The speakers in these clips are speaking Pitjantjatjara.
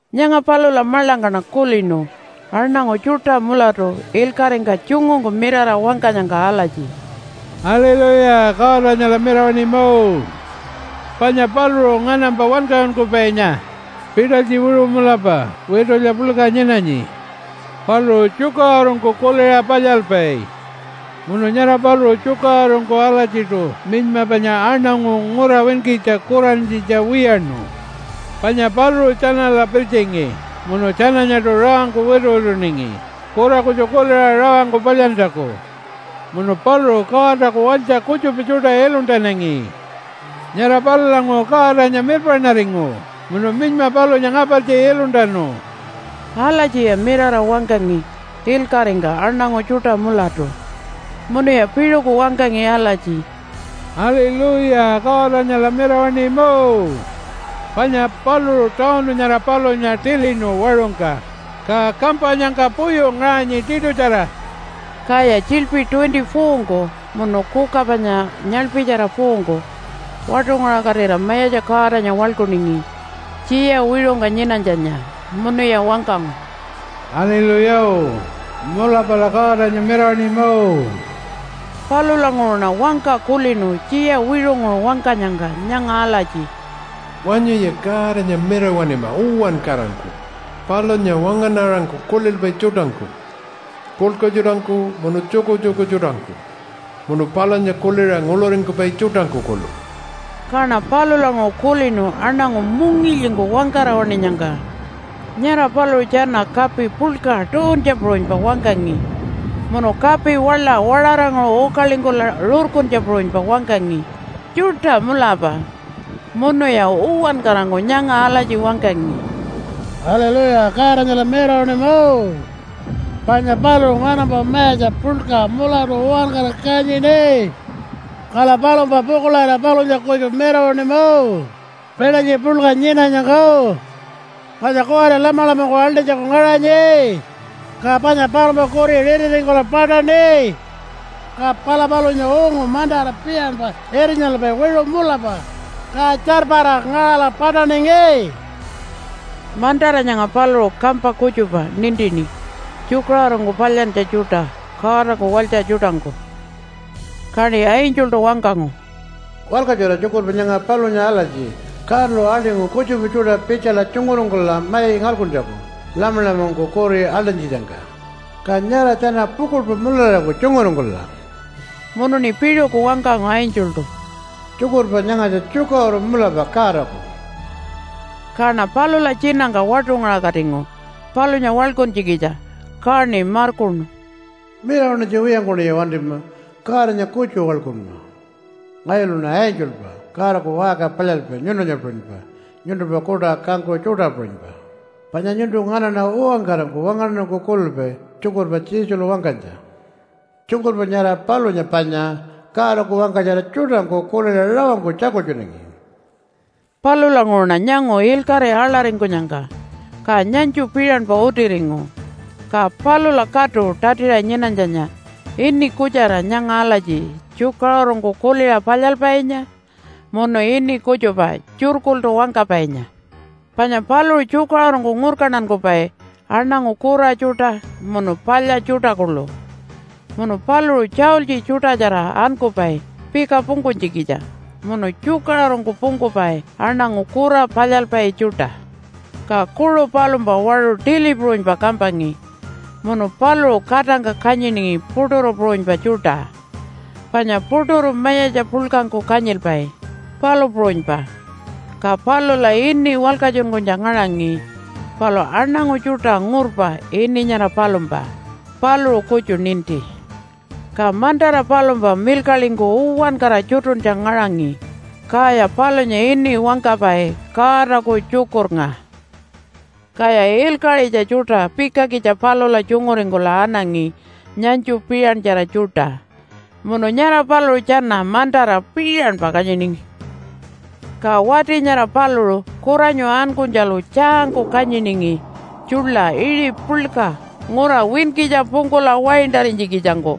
Nyanga palula maḻangkaṉa kulinu aṉangu tjuṯa mulatu ilkaṟingka tjungungku mirara wangkanyangka alatji, “Aliluya! Godanyala mirawaṉima! Panya paluṟu nganampa wankaṟunkupainya, pitalytji wiṟu mulapa witulya puḻka nyinanyi. Paluṟu tjukaṟurungku kuliṟa palyalpai. Munu nyara paluṟu tjukaṟurungku alatjiṯu minyma panya aṉangu ngura winkitja kurantjitja wiyaṉu. Panya paluṟu tjanala pirtjingi munu tjananyaṯu rawangku wituwituningi kura kutju kuliṟa rawangku palyantjaku. Munu paluṟu Godaku walytja kutjupa tjuṯa iluntanangi. Nyara palulanguṟu Godanya mirpaṉaringu munu minyma palunya ngapartji iluntanu.” Alatjiya mirara wangkangi ilkaṟingka aṉangu tjuṯa mulatu. Munuya piṟuku wangkangi alatji, “Aliluya, Godanyala mirawaṉima! Panya paluṟu tawunu nyara palunya tilinu waṟungka, ka kampanyangka puyu ngaṟanyi tiṯutjara.” Kaya tjiḻpi 24-ngku munu kuka panya nyaḻpitjara 4-ngku waṯungaṟakatira Mayatja Godanya waḻkuningi tjiya wiṟungka nyinanytjanya. Munuya wangkangu, “Aliluya! Mulapala Godanya mirawaṉima!” Palulanguṟuṉa wangka kulinu tjiya wiṟunguṟu wangkanyangka nyanga alatji, “Wanyuya Godanya mirawaṉima uwankarangku palunya wangaṉarangku kulilpai tjuṯangku, puḻka tjuṯangku munu tjukutjuku tjuṯangku munu palunya kuliṟa nguḻuringkupai tjuṯangku kuḻu.” Kaṉa palulanguṟu kulinu aṉangu mungilyingku wangkara waṉinyangka. Nyara paluṟu tjana kapi puḻka tuuntja puṟunypa wangkangi munu kapi waḻa waṟaranguṟu ukalingkula rurkuntja puṟunypa wangkangi tjuṯa mulapa. Munuya uwankarangku nyanga alatji wangkangi, “Aliluya! Godanyala mirawaṉima! Panya paluṟu nganampa mayatja puḻka mulatu uwankara kanyini. Kala palumpa pukuḻarira palunya kutju mirawaṉima pitalytji puḻka nyinanyangka. Panya kuwari Lamalamangku aḻṯinytjaku ngaṟanyi, ka panya palumpa kuri ritiringkula paṯaṉi. Ka pala palunya ungu mantara piṟanpa irnyalpai wiṟu mulapa, ka tjarpara ngaṟala paṯaningi.” (Mantara nyanga paluṟu kampa kutjupa nintini tjukaṟurungku palyantja tjuṯa Godaku walytja tjuṯangku.) Kaṉi angeltu wangkangu, “Walkatjura tjukurpa nyanga palunya alatji, ‘Godalu aḻṯingu kutjupa tjuṯa pitjala tjunguringkula mai ngalkuntjaku Lamalamangku kuri aḻṯinytjitjangka. Ka nyara tjana pukuḻpa mularariku tjunguringkula.’” Munuṉi piṟuku wangkangu angeltu, “Tjukurpa nyangatja tjukaṟuru mulapa Godaku.” Kaṉa palula tjinangka waṯungaṟakatingu palunya waḻkuntjikitja, kaṉi markuṉu, “Mirawaṉinytja wiyangkuṉi wantima, Godanya kutju waḻkunma. Ngayuluṉa angelpa Godaku waṟka palyalpai nyuntunya puṟunypa, nyuntumpa kuṯa kangkuṟu tjuṯa puṟunypa, panya nyuntu nganaṉa uwankarangku wangaṉarangku kulilpai tjukurpa Jesulu wangkanytja. Tjukurpa nyara palunya panya Godaku wangkatjara tjuṯangku kuliṟa rawangku tjakultjunangi.” Palulanguṟuṉa nyangu ilkaṟi aḻaringkunyangka, ka nyanytju piṟanpa utiringu. Ka palula katu tatiṟa nyinanytjanya ini kutjara nyanga alatji Tjukaṟurungku Kuliṟa Palyalpainya, munu ini kutjupa Tjurkultu Wangkapainya. Panya paluṟu tjukaṟurungku ngurkantankupai aṉangu kura tjuṯa munu palya tjuṯa kuḻu, munu paluṟu tjaultji tjuṯatjara ankupai pika pungkunytjikitja munu tjukaṟurungku pungkupai aṉangu kura palyalpai tjuṯa. Ka kuṟu palumpa waṟu tili puṟunypa kampangi munu paluṟu katangka kanyiningi puṯuru puṟunypa tjuṯa, panya puṯuru mayatja puḻkangku kanyilpai, palu puṟunypa. Ka palula ini walkatjunkunytja ngaṟangi palu aṉangu tjuṯa ngurpa ini nyara palumpa, paluṟu kutju ninti. Ka mantara palumpa milkaḻingku uwankara tjutuntja ngaṟangi, kaya palunya ini wangkapai Godaku Tjukurnga. Kaya ilkaṟitja tjuṯa pikakitja palula tjunguringkula anangi nyanytju piṟantjara tjuṯa munu nyara paluṟu tjana mantara piṟanpa kanyiningi. Ka wati nyara paluṟu kuranyu ankunytjalu tjaangku kanyiningi tjuḻa iṟi puḻka ngura winkitja pungkula waintarinytjikitjangku.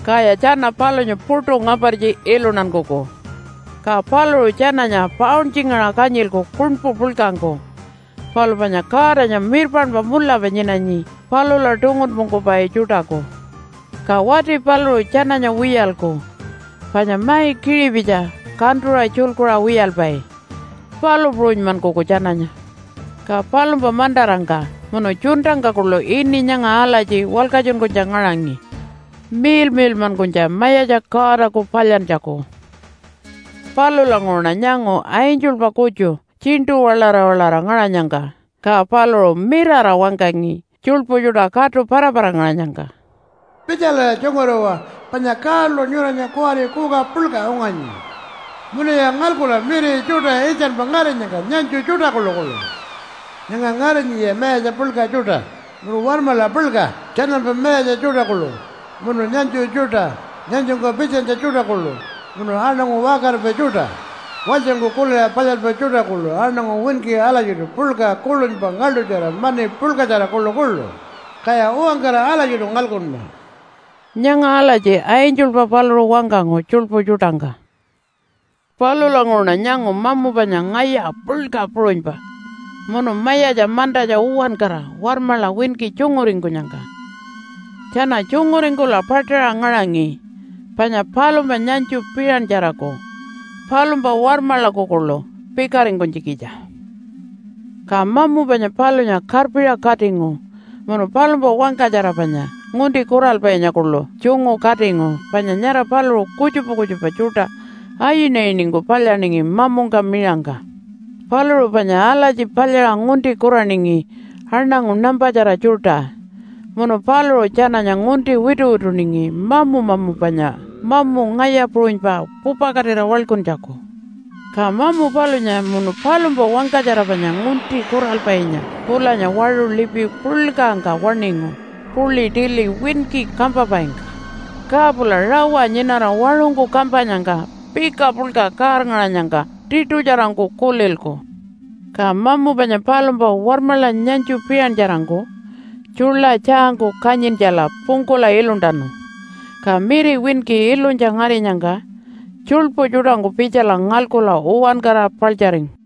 Kaya tjana palunya puṯu ngapartji iluntankuku. Ka paluṟu tjananya pauntjingaṟa kanyilku kuṉpu puḻkangku. Palu panya Godanya mirpaṉpa mulapa nyinanyi palula tungunpungkupai tjuṯaku. Ka wati paluṟu tjananya wiyalku. Panya mai kiṟipitji kantuṟa tjulkuṟa wiyalpai, palu puṟunymankuku tjananya. Ka palumpa mantarangka munu tjuntangka kuḻu ini nyanga alatji walkatjunkunytja ngaṟangi, Miḻmiḻmankunytja Mayatja Godaku Palyantjaku. Palulanguṟuṉa nyangu angelpa kutju tjiṉṯu-waḻara-waḻara ngaṟanyangka. Ka paluṟu mirara wangkangi tjuḻpu tjuṯa katu para-para-ngaṟanyangka, “Pitjalaya tjunguriwa panya Godalu nyuranya kuwari kuka puḻka unganyi. Munuya ngalkula miri tjuṯa iltjanpa ngarinyangka nyanytju tjuṯa kuḻukuḻu. Nyanga ngarinyiya mayatja puḻka tjuṯa, munu warmaḻa puḻka, tjanampa mayatja tjuṯa kuḻu munu nyanytju tjuṯa, nyanytjungka pitjanytja tjuṯa kuḻu munu aṉangu waṟkaripai tjuṯa, walytjangku kuliṟa palyalpai tjuṯa kuḻu, aṉangu winki alatjiṯu puḻka, kuḻunypa, ngaḻṯutjara, mani puḻkatjara kuḻukuḻu, kaya uwankara alatjiṯu ngalkunma.” Nyanga alatji angelpa paluṟu wangkangu tjuḻpu tjuṯangka. Palulanguṟuṉa nyangu mamu panya ngaya puḻka puṟunypa munu mayatja mantatja uwankara warmaḻa winki tjunguringkunyangka. Tjana tjunguringkula paṯaṟa ngaṟangi panya palumpa nyanytju piṟantjaraku palumpa warmaḻaku kuḻu pikaringkunytjikitja. Ka mamu panya palunya karpiṟa katingu munu palumpa wangkatjara panya ngunti kuralpainya kuḻu tjungu katingu panya nyara paluṟu kutjupa kutjupa tjuṯa ayinayiningku palyaningi mamungka miṟangka. Paluṟu panya alatji palyaṟa ngunti kuraningi aṉangu nampatjara tjuṯa munu paluṟu tjananya ngunti wituwituningi mamu-mamu panya mamu ngaya puṟunypa pupakatira waḻkuntjaku. Ka mamu palunya munu palumpa wangkatjara panya ngunti kuralpainya pulanya waṟu lipi puḻkangka waṉingu puḻi tili winki kampapaingka. Ka pula rawa nyinara waṟungku kampanyangka pika puḻka kaarngaṟanyangka tiṯutjarangku kulilku. Ka mamu panya palumpa warmaḻa nyanytju piṟantjarangku tjuḻa tjaangku kanyintjala pungkula iluntanu, ka miri winki ilunytja ngarinyangka tjuḻpu tjuṯangku pitjala ngalkula uwankara paḻtjaringu.